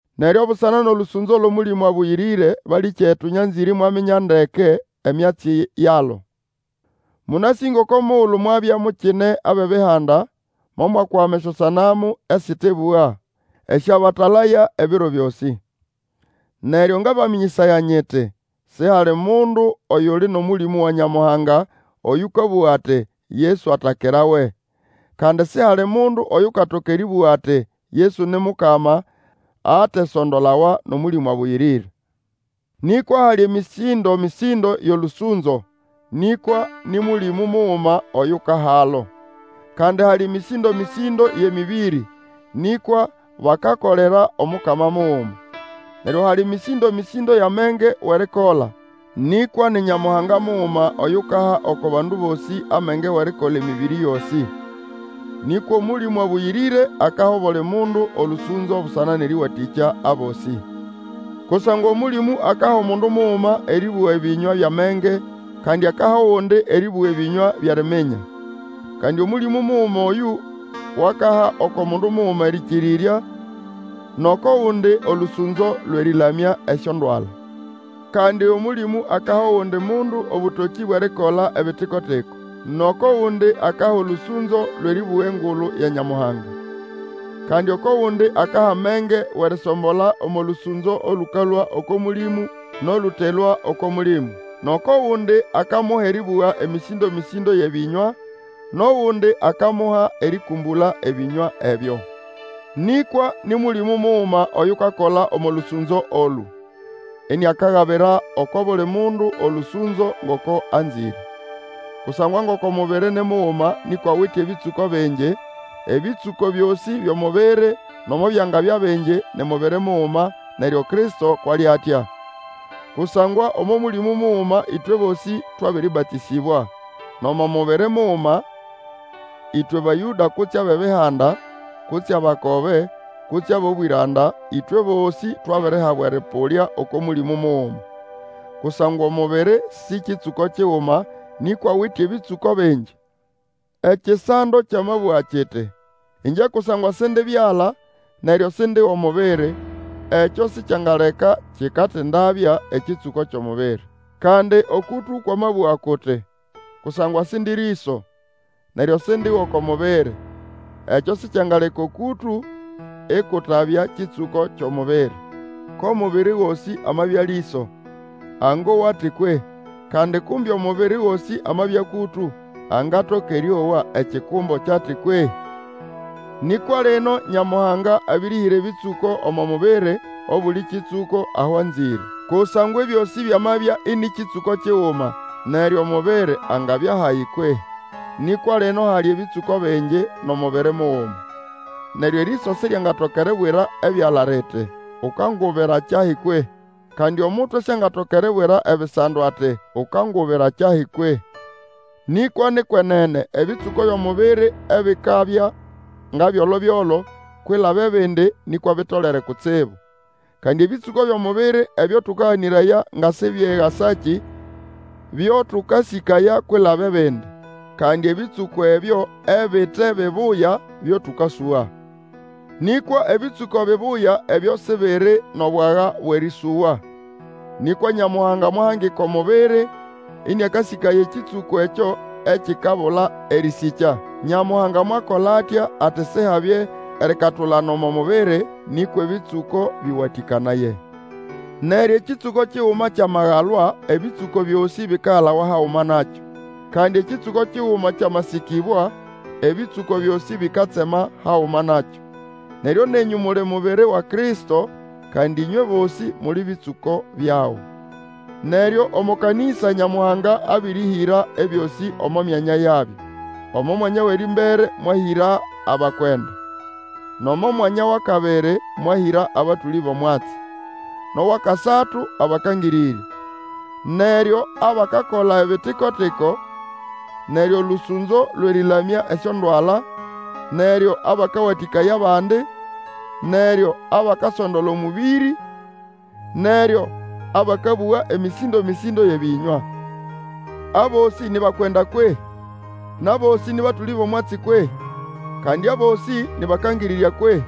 Neryo busana nʼolũsũnzo lwʼOmũlĩmũ Abũyĩrĩre, balĩkyetu, nyanzĩre imwaminya ndeke emyatsi yalo. Mũnasĩ ngoko mugulu mwabya mukine abʼEbihanda momwakwama esyosanamu esĩtebũga, esyabatalaya ebiro byosĩ. Neryo ngabamĩnyĩsaya nyiti, sihali mundu oyuli nʼOmũlĩmũ wa Nyamuhanga, oyũkabũga ati, Yesu atakirawe; kandi sihali mundu oyukatoka erĩbũga ati, Yesu ni Mukama, atesondolawa nʼOmũlĩmũ Abũyĩrĩre. Nĩkwa hali mĩsĩndo-mĩsĩndo yʼolũsũnzo, nĩkwa nĩ Mũlĩmũ muguma oyukahalo. Kandi hali mĩsĩndo-mĩsĩndo yʼemĩbĩrĩ, nĩkwa bakakolera Omukama muguma. Neryo hali mĩsĩndo-mĩsĩndo yʼamenge wʼerikola, nĩkwa ni Nyamuhanga muguma oyukaha oko bandu bosĩ amenge wʼerikola emĩbĩrĩ yosĩ. Nĩkwa Omũlĩmũ Abũyĩrĩre akaha obuli mundu olũsũnzo busana nʼerĩwatĩkya abosĩ. Kusangwa Omũlĩmũ akaha omundu muguma erĩbũga ebĩnywa byʼamenge, kandi akaha ogundi erĩbũga ebĩnywa byʼeriminya. Kandi Omũlĩmũ muguma oyũ wakaha oko mundu muguma erĩkĩrĩrya, nʼoko gundi olũsũnzo lwʼerĩlamya esyondwala. Kandi Omũlĩmũ akaha ogundi mundu obũtokĩ bwʼerikola ebitikotiko; nʼoko gundi akaha olũsũnzo lwʼerĩbũga engulu ya Nyamuhanga; kandi oko gundi akaha amenge wʼerisombola omo lũsũnzo olũkalũa oko Mũlĩmũ nʼolũtelũa oko Mũlĩmũ. Nʼoko gundi, akamuha erĩbũga emĩsĩndo-mĩsĩndo yʼebĩnywa, nʼogundi akamuha erĩkũmbũla ebĩnywa ebyo. Nĩkwa nĩ Mũlĩmũ muguma oyukakola omo lũsũnzo olũ, iniakagabira oko buli mundu olũsũnzo, ngoko anzĩre. Kusangwa ngoko mubiri ni muguma nĩkwa awite ebĩtsũko bingi; nʼebĩtsũko byosĩ byʼomubiri nomo byangabya bingi, ni mubiri muguma, neryo Kristo kwʼali atya. Kusangwa omo Mũlĩmũ muguma ĩtwe bosĩ twabĩrĩbatĩsĩbwa, nʼomo mubiri muguma, ĩtwe Bayũda kutse abʼEbihanda, kutse abakobe, kutse abʼobwĩranda; ĩtwe bosĩ twabirihabwa erĩpũlya oko Mũlĩmũ muguma. Kusangwa omubiri sĩ kĩtsũko kiguma, nĩkwa awite ebĩtsũko bingi. Ekisando kyamabũga kiti, ĩngye kusangwa Sindi byala, neryo Sindi wʼomubiri, ekyo sikyangaleka kikatindabya ekĩtsũko kyʼomubiri. Kandi okũtũ kwamabũga kuti, Kusangwa Sindi rĩso, neryo Sindi wʼoko mubiri, ekyo sikyangaleka okũtũ ikutabya kĩtsũko kyʼomubiri. Ko mubiri gosĩ amabya lĩso, angowa ati kwehĩ? Kandi kumbe omubiri gosĩ amabya kũtũ, angatoka erĩowa ekikumbo kyʼati kwehĩ? Nĩkwa lino Nyamuhanga abĩrĩhĩra ebĩtsũko omo mubiri, obuli kĩtsũko aho anzĩre. Kusangwa ebyosĩ byamabya ĩnĩ kĩtsũko kiguma, neryo omubiri angabya hayi kwehĩ Nĩkwa lino hali ebĩtsũko bingi, nʼomubiri muguma. Neryo erĩso siryangatoka eribwira ebyala liti, Ukangubira kyahi kwehĩ? Kandi omutwe siangatoka eribwira ebisando, ati, Ukangubira kyahi kwehĩ? Nĩkwa ni kwenene ebĩtsũko byʼomubiri ebikabya nga byolo-byolo kwilaba ebindi, nĩkwa bitolere kutsibu. Kandi ebĩtsũko byʼomubiri ebyo tũkaganĩraya nga sibyegasakĩ, byo tũkasĩkaya kwilaba ebindi. Kandi ebĩtsũko ebyo ebite bibuya byo tũkasũga. Nĩkwa ebĩtsũko bibuya ebyo Sibiri nʼobwaga bwʼerĩsũgwa. Nĩkwa Nyamuhanga mwahangika omubiri, ĩnĩakasĩkaya ekĩtsũko ekyo ekikabula erĩsĩkya. Nyamuhanga mwakola atya ati Sihabye erikatulana omo mubiri, nĩkwa ebĩtsũko bĩwatĩkanaye. Neryo ekĩtsũko kiguma kyamagalwa, ebĩtsũko byosĩ bikagalawa haguma nakyo; kandi ekĩtsũko kiguma kyamasĩkĩbwa, ebĩtsũko byosĩ bikatsema haguma nakyo. Neryo nenyũ muli mubiri wa Kristo, kandi ĩnywe bosĩ muli bĩtsũko byago. Neryo omo kanĩsa, Nyamuhanga abĩrĩhĩra ebyosĩ omo mianya yabyo; omo mwanya wʼerĩmbere mwahĩra abakwenda, nʼomo mwanya wʼakabiri mwahĩra abatũlĩ bʼomwatsi, nʼowʼakasatu, abakangĩrĩrya, neryo abakakola ebitiko-tiko, neryo olũsũnzo lwʼerĩlamya esyondwala, neryo abakawatĩkaya abandi, neryo abakasondola omũbĩrĩ, neryo abakabũga emĩsĩndo-mĩsĩndo yʼebĩnywa. Abosĩ ni bakwenda kwehĩ? Nʼabosĩ nĩ batũlĩ bʼomwatsi kwehĩ? Kandi abosĩ nĩ bakangĩrĩrya kwehĩ?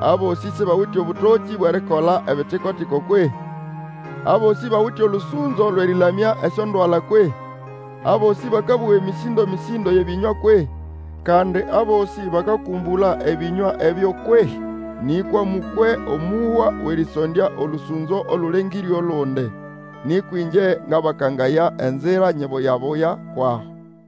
Abosĩ sibawite obũtokĩ bwʼerikola ebito-tiko kwehĩ? Abosĩ bawite olũsũnzo lwʼerĩlamya esyondwala kwehĩ? Abosĩ bakabũga emĩsindomĩsĩndo yʼebĩnywa kwehĩ? Kandi abosĩ bakakũmbũla ebĩnywa ebyo kwehĩ? Nĩkwa mũkwe omũhwa wʼerĩsondya olũsũnzo olũlengĩre olundi. Nĩkwa ĩngye ngabakangaya enzira nyibuya-buya kwʼaho.